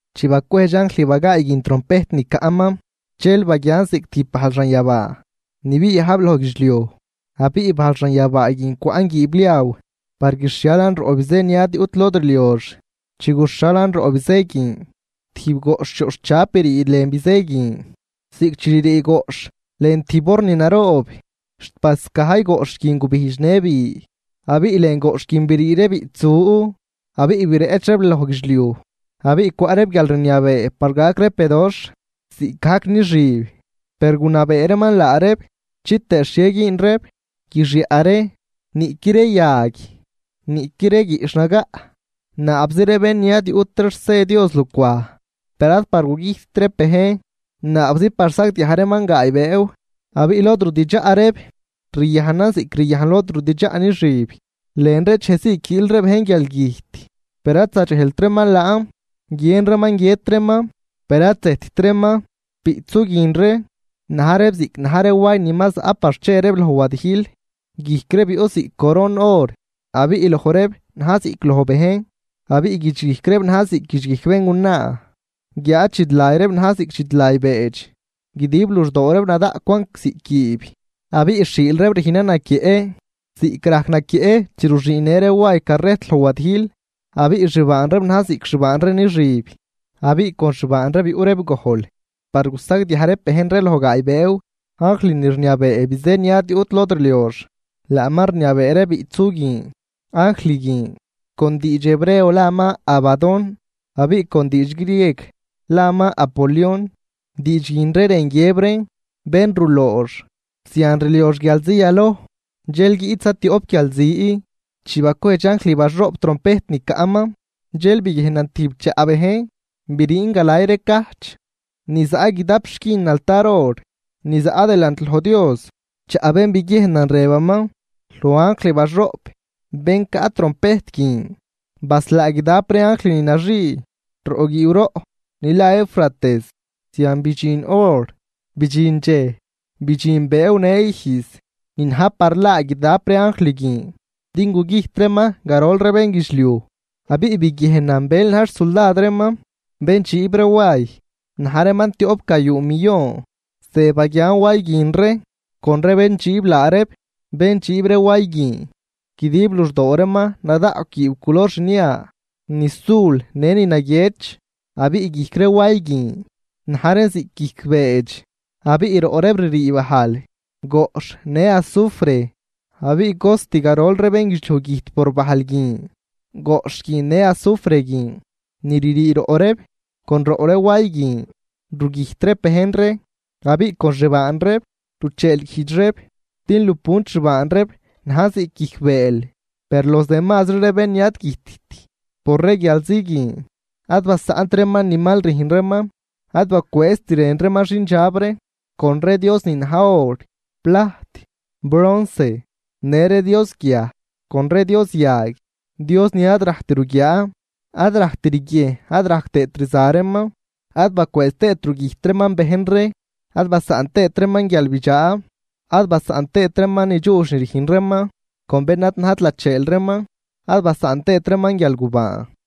Chi bacwejdx anjl bagaay guin trompejt ni caꞌman, dxel baguian ziꞌc tijb bajl xanyabaa ni biajb loj guidxliuj, abiꞌ bajl xanyabaa guin cwaꞌn guiibliaw par guixhialan roꞌ bizë ni ad yuꞌt lod rliox. Chi guxhalan roꞌ bizë guin tijb goꞌxh yoꞌxhchab brii lën bizëë guin ziꞌc chi ririi goꞌxh lën tijb horn naroob, xt bascajy goꞌxh guin gubijdx në bi. Abiꞌ lën goꞌxh guin brii ree biꞌtsu abiꞌ bireꞌch reeb loj guidxliuj, abiꞌ cwaꞌ reeb guialrniabee par gac reeb bedoxh ziꞌcgajc nixüb. Per gunabee reeman laa reeb chitëë xhie güün reeb guixyaꞌ ree, niꞌqui ree yag, niꞌqui ree guiꞌxh nagaꞌ. Naabzi ree bén ni ad yuꞌt ree xse Dios lucwaj. Per ad par gugüjtt reeb bejn, naabzi par sagdiaj reeman gaay bëëw. Abiꞌ lod rudidxaꞌ reeb riyajnan ziꞌc ryajn lod rudidxaꞌ nixüb. Lën ree dxejzii quiil ree bejn guialgüjt, per ad zadxejlt reeman laan. Guiën reeman guiët reeman per ad zëjtt reeman. Biꞌtsu guin ree na̱j reeb ziꞌc na̱j ree way ni ma zaꞌ par che reeb loj wadijl, guijc reeb yuꞌ ziꞌc coron or, abiꞌ loj reeb na̱j ziꞌc loj bejn. Abiꞌ guidxguijc reeb na̱j ziꞌc guidxguijc béngunaa, guiáad dxidlay reeb na̱j ziꞌc dxidlay beedx. Guidib luxdoo reeb nadaꞌcwan ziꞌc guiib, abiꞌ xhiil reeb rüjnan naquieꞌ ziꞌc rajc naquieꞌ chi ruxüünnë ree way carrejt loj wadijl. Abiꞌ xbaan reeb na̱j ziꞌc xbaan ree nixüb, abiꞌ con lupuntan rudidxaꞌ reeb. Con xbaan reeb yuꞌ reeb gojl par gusagdiaj reeb bejn ree loj gaay bëëw. Anjl ni rniabee bizë ni ad yuꞌt lod rliox laaman rniabee ree biꞌtsu guin. Anjl guin con diidx Hebreo laaman Abadón, abiꞌ con diidx grieg laaman Apolión, diidx guin ree rën guiëb reen bén ruloox. Zian rliox guialzi yaloj, dxel guiꞌt zatioꞌp guialzi. Chi bacwejdx anjl baxoꞌp trompejt ni caꞌman, dxel biguiejnan tijb chaꞌ bejn briin galay ree cajch ni zaꞌ guidap xquin altar or ni zaꞌ delant loj Dios. Chaꞌ bén biguiejnan rëbaman loj anjl baxoꞌp bén caꞌ trompejt guin: ―Baslaa guidap ree anjl ni naxii roꞌ guiiw roꞌ ni la Eufrates. Zian bidxin or, bidxin dxej, bidxin bëëw në ijz ni na̱j par laa guidap ree anjl guin din gugüjt reeman garol ree bénguidxliuj. Abiꞌ biguiejnan bël na̱j xsuldad reeman bén dxiib ree way. Na̱j reeman tioꞌpgayuu millon. Ze baguian way guin ree con ree bén dxiib laa reeb: Bén dxiib ree way guin, guidib luxdoo reeman nadaꞌcw guiib culor xnia, ni sul në ni naguiëch. Abiꞌ guijc ree way guin na̱j reen ziꞌc guijc ree beedx, abiꞌ roꞌ reeb ririi bajl, goꞌxh në azufre. Abiꞌ garol ree bénguidxliuj güjt por bajl guin, goꞌxh guin në azufre guin ni ririi roꞌ reeb. Con roꞌ ree way guin rugüjt reeb bejn ree, abiꞌ con xbaan reeb rucheelguijdx reeb din lupunt xbaan reeb najn ziꞌc guijc bëël. Per los demasri ree bén ni ad güjtt por ree guialzi guin, ad basaꞌnt reeman ni mal rüjn reeman. Ad bacwëëzt rën reeman xindxab ree con ree Dios ni na̱j or, plajt, bronce në ree dios guiaj con ree dios yag, dios ni ad rajct ruguiaa, ad rajct riguiejn ad rajc tëët rza reeman. Ad bacwëëz tëët rugüjt reeman bejn ree, ad basaꞌn tëët reeman guialbidxaa, ad basaꞌn tëët reeman ni dxuudx ni rüjn reeman con bén ad najt lacheel reeman, ad basaꞌn tëët reeman guialgubaan.